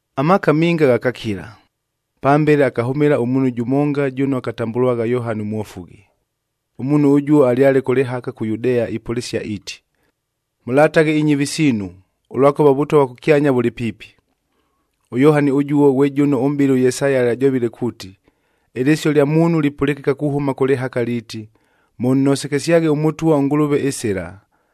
Amaaka minga ghakakila. Pambele akahʉmɨla ʉmuunhu jʉmonga jʉno akatambʉlwagha Yohani Mwofughi. Ʉmuunhu ʉjuo alyale kʉ lɨhaka kʉ Yudea ipʉlɨsia, iiti, “Mʉlataghe inyɨvi siinu, ʉlwakʉva ʉVʉtwa vwa kʉkyanya vʉlɨ piipi.” ɄYohani ʉjuo ghwe jʉno ʉmʼbɨli ʉYesaya alyajovile kuuti, “Ɨlɨsio lya muunhu lipʉlɨkɨka kuhʉma kʉ lɨhaka liiti, ‘Mʉnnosekesyaghe ʉMʉtwa ʉNgʉlʉve ɨsɨla,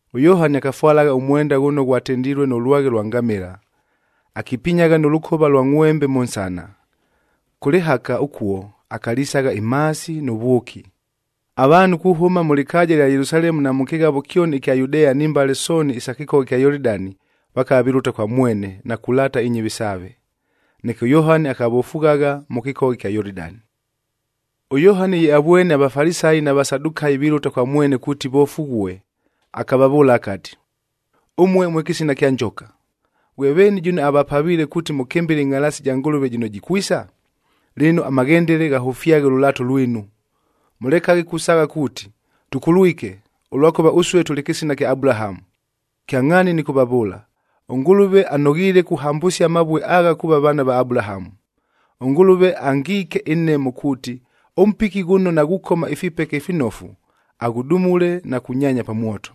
ɄYohani akafwalagha ʉmwenda ghʉno ghwatendilue nʉ lwaghe lwa ngamɨla,b akipinyagha nʉ lʉkova ʉlwa ngʼhwembe mʉ nsana. Kʉ lɨhaka ʉkuo, akalisagha imhaasi nʉ vwʉki. Avaanhu kuhʉma mʉ lɨkaaja ɨlya Yelusalemu na mʉ kɨghavo kyoni ɨkya Yudea ni mbale sooni isa kɨkogha ɨkya Yolidani, na kulaata inyɨvi saave. Neke ʉYohani akavofughagha mʉ kɨkogha ɨkya Yolidani. ɄYohani ye avwene aVafalisayi na Vasadukayic vilʉta kwa mwene kuuti vofughue, akavavʉʉla akati, “Ʉmue mwe kɨsina kya njoka! Ghwe veeni jʉno avapaviile kuuti mʉkɨmbɨle ɨngʼhalaasi ja Ngʉlʉve jɨno jikwisa? Lɨno, amaghendele ghahʉfyaghe ʉlʉlaato lwinu. Mʉlekaghe kusaagha kuuti, ‘Tʉkulwike, ʉlwakʉva ʉsue tʉlɨ kɨsina kya Abulahamu!’d Kyangʼhaani nɨkʉvavʉʉla, ʉNgʉlʉve anoghiile kuhambʉsia amavue agha kuuva vaana va Abulahamu! ɄNgʉlʉve angiike ɨnhemo, kuuti ʉmpiki ghʉno naghukoma ifipeke ifinofu, aghʉdumule na kunyaanya pa mwoto.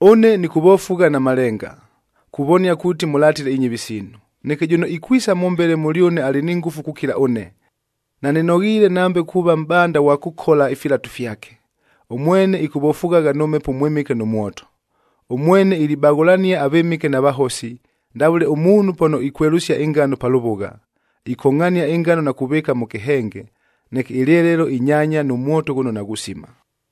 “Ʉne nɨkʉvofugha na malenga, kuvonia kuuti mʉlatile inyɨvi siinu. Neke jʉno ikwisa mʉmbele mʉlyʉne alɨ ni ngʉfu kukila ʉne. Nanɨnoghiile nambe kuuva mʼbanda ghwa kʉkola ifilatu fyake. Ʉmwene ɨkʉvofughagha nʉ Mhepo ʉMwɨmɨke nʉ mwoto. Ʉmwene ilibaghʉlania avɨmɨke na vahosi, ndavʉle ʉmuunhu pano ikwelʉsia ɨngano pa lʉvʉgha, ikongʼhania ɨngano na kuvɨɨka mʉ kɨhenge, neke ɨlyelelo inyaanya nʉ mwoto ghʉno naghusima.”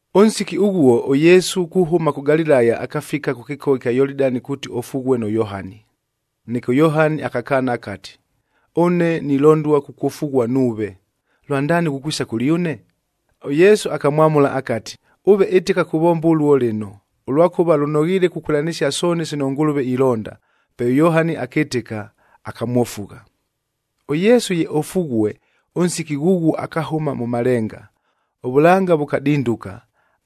Ʉnsiki ʉghuo, ʉYesu kuhʉma kʉ Galilaya, akafika kʉ kɨkogha ɨkya Yolidani kuuti ofughue nʉ Yohani. Neke ʉYohani akakaana akati, “Ʉne nilondua kukwofughua nuuve, lwandaani ghukwisa kʉlyʉne?” ɄYesu akamwamʉla akati, “Ʉve ɨtɨka kuvomba ʉluo lɨno, ʉlwakʉva lʉnoghiile kukwɨlanɨsia sooni sino ʉNgʉlʉve ilonda.” Pe ʉYohani akɨtɨka, akamwofugha. ɄYesu ye ofughue, ʉnsiki ghʉghuo akahʉma mʉ malenga. Ʉvʉlanga vʉkadinduka,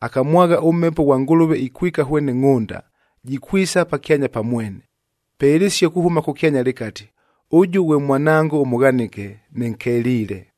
akamwagha ʉMhepo ghwa Ngʉlʉve ikwika hwene ngʼhʉnda, jikwisa pakyanya pa mwene! Pe ɨlɨsio kuhʉma kʉkyanya lɨkati, “Ʉjʉ ghwe Mwanango ʉmʉghanɨke, nɨnkeliile.”